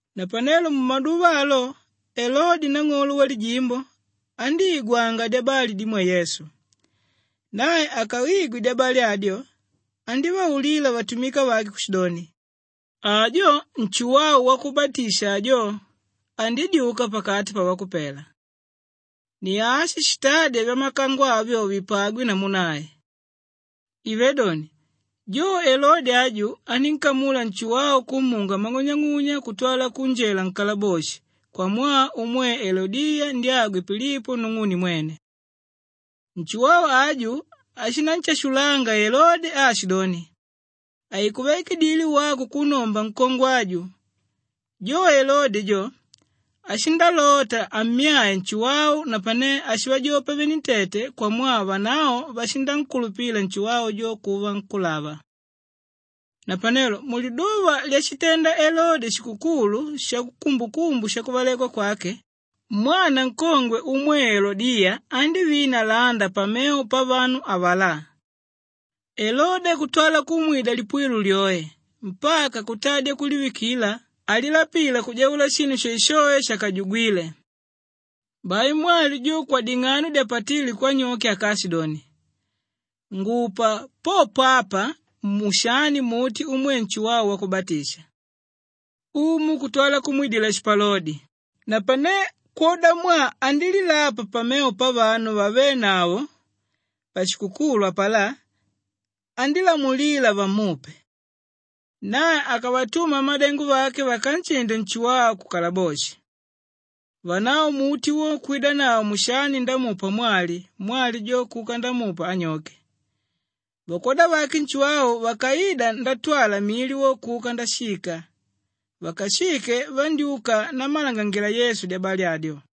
Napanelo mumaduva alo Elode nang'olo walijimbo andíigwanga dyabali dimwe Yesu. Nae akaigwe dyabali adyo andívaulila vatumika vake kushidoni, “Ajo Nshuwau Wakubatisha ajo! Andidyuka pakati pavakupela. Ni ashi shitádya vyamakango avyo vipagwe namu nae.” Ivé doni, jo Elode aju anínkamula Nshuwau kumunga mang'unyang'unya kutwala kunjela nkalaboshi kwamwaa umwe Elodiya ndyagwe Pilipo nung'une mwene. Nshuwau aju ashinanshashulanga Elode aashidoni, “Haikuvaikidile wako kunnomba nkongwe aju.” Jo Elode jo, ashindalota ammyae Nshuwau napane ashivajopa venentete kwamwaa vanavo vashinankulupila Nshuwau jo kuva nkúlava. Napanelo muliduva lyashitenda Elode shikukulu shakumbukumbu yakuvalekwa kwake, mwana nkongwe umwe Elodiya andívina landa pamevo pavanu avalá. Elode kutwa kumwida lipuwilo lyoe mpaka kuntadya kulivikila alilapila kujaula shinu shoeshoe shakajugwile. Bai mwali jo kwading'ano dyapatíle kwanyoke akaashidoni, “Ngupa popo apa mushani muti umwe Nshuwau Wakubatisha.” Umu kutwala kumwidila shipalodi, napane kwodamwaa andílilapa pamevo pavanu vavénavo pashikukulu apalá, andílamulila vamupe. Nae akavatuma vamadengo vake vakanshinde Nshuwau kukalaboshi. Vanavo muti wo kwidanavo mushani ndamupa mwali, mwali jo kuka ndamupa anyoke. Vakwoda vake Nshuwau vakaida ndatwala mili wo kuka ndashika. Vakashike vandyúka nammalangangila Yesu dyabali adyo.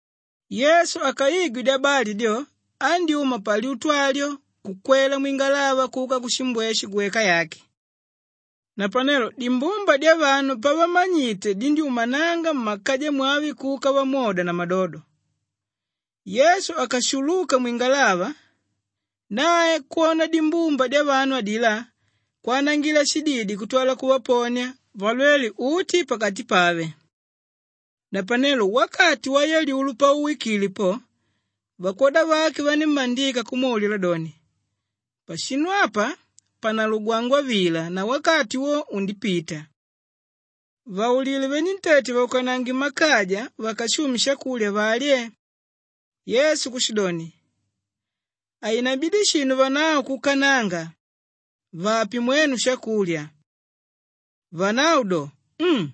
Yesu akaigwe dyabali dyo andyúma palyutu alyo kukwela mwingalava kuka kushimbweshe gweka yake. Napanelo dimbumba dyavanu pavamanyite dindyúmananga mmakaja mwave kuka vamwoda na madodo. Yesu akashuluka mwingalava, nae kwona dimbumba dyavanu adilá, kwanangila shididi kutwala kuvaponia valwele uti pakati pave. Napanelo wakati wayalyulo pauwikile po, vakwoda vake vanímmandika kumwaulila doni, “Pashinu apa panalugwangwa vila na wakati wo undipita. Vaulile venentete vaukanange mmakaja vakashume shakulya valye.” Yesu kushidoni, “Hainabidi shinu vanavo kuukananga. Vape mwenu po shakulya.” Vanavo do, “Um!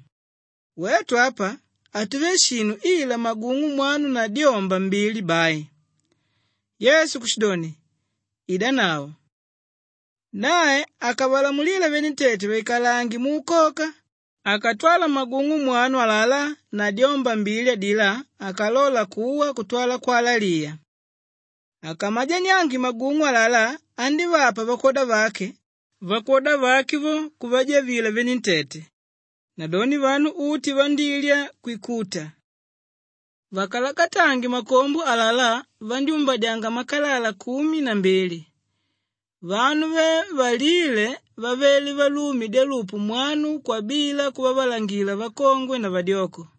Wetu apa hatuve shinu ila magung'u mwanu na dyomba mbili bai.” Yesu kushidoni, “Idanavo.” Nae akavalamulila venentete vaikalange muukoka, akatwala magung'u mwanu alalá na dyomba mbili adilá, akalola kuwa kutwala kwalaliya. Akamajaniange magung'u alalá andívapa vakwoda vake, vakwoda vake vo, kuvajavila venentete. Nadoni vanu uti vandílya kwikuta. Vakalakatange makombo alalá, vandyúmbadya makalala kumi na mbili. Vanu ve valíle vavele valume dyalupu mwanu kwabila kuvavalangilila vakongwe na vadyoko.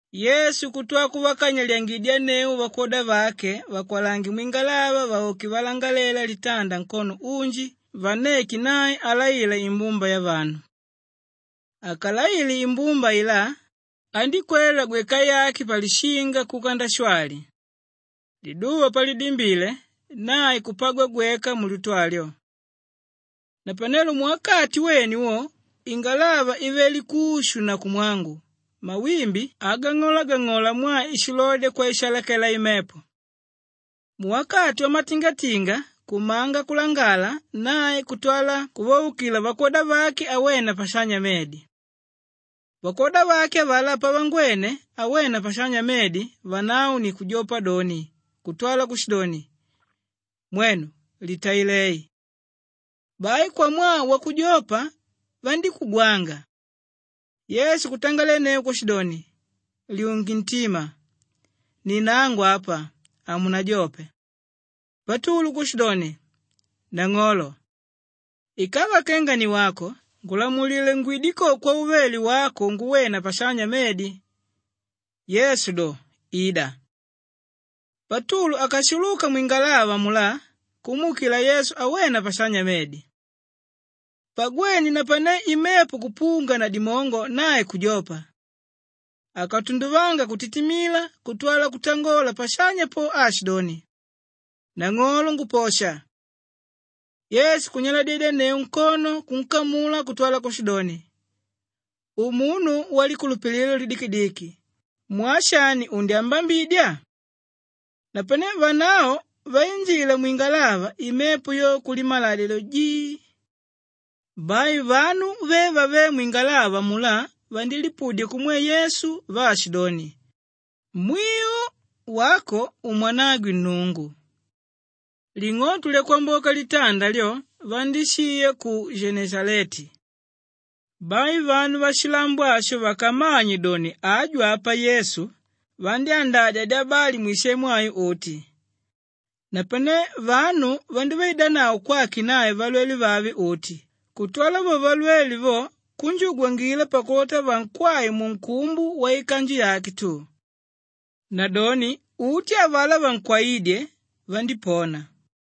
Yesu kutwala kuvakanyalidyangidyanneu vakwoda vake vakwalange mwingalava vauke valangalela litanda nkono unji vanneke nae alaila imbumba yavanu. Akalaile imbumba ailá, andíkwela gweka yake palishinga kuka ndashwali. Liduva palidimbile, nae kupagwa gweka mulyutu alyo. Napanelo muwakati wene wo ingalava ivele kushu na kumwangu mawimbi agang'olagang'ola mwaa ishilodya kwaishaalakela imepo. Muwakati wamatingatinga kumanga kulangala nae kutwala kuvaukila vakwoda vake awena pashanya medi. Vakwoda vake avalá pavangwene awena pashanya medi vanavo ni kujopa doni kutwala kushidoni, “Mwenu litailei!” Bai kwamwaa wakujopa vandíkugwanga. Yesu kutangalenneu kushidoni, “Lyunge ntima! Ni nangu apa. Hamunajope.” Patulu kushidoni, “Nang'olo, ikava kenga ni wako ngulamulila ngwide ko kwauvele wako nguwena pashanya medi.” Yesu do, “Ida!” Patulu akashuluka mwingalava amulá kumuukila Yesu awena pashanya medi. Pagwene napane imepo kupunga na dimongo nae kujopa. Akatunduvanga kutitimila kutwala kutangola pashanya po aashidoni, “Nang'olo nguposha!” Yesu kunyaladyedyanneu nkono kunkamula kutwala kushidoni, “Umunu walikulupililo lidikidiki, mwaa shani undyambambidya?” Napane vanavo vainjila mwingalava, imepo yo kulimaladya do, jii. Bai vanu ve vavéle mwingalava amulá vandilipudya kumwe Yesu vaashidoni, “Mwiu, wako umwanagwe Nnungu.” Ling'oto lyakwamboka litanda lyo vandíshiya ku Geneshaleti. Bai vanu vashilambo asho vakammanye doni aju apa Yesu, vandyandadya dyabali mwisemu ayo uti. Napane vanu vandívaidanavo kwake nae valwele vave uti kutwala vo valwele vo kunjugwangila pakulota vankwae munkumbu waikanju yake tu. Nadoni uti avalá vankwaídye, vandípona.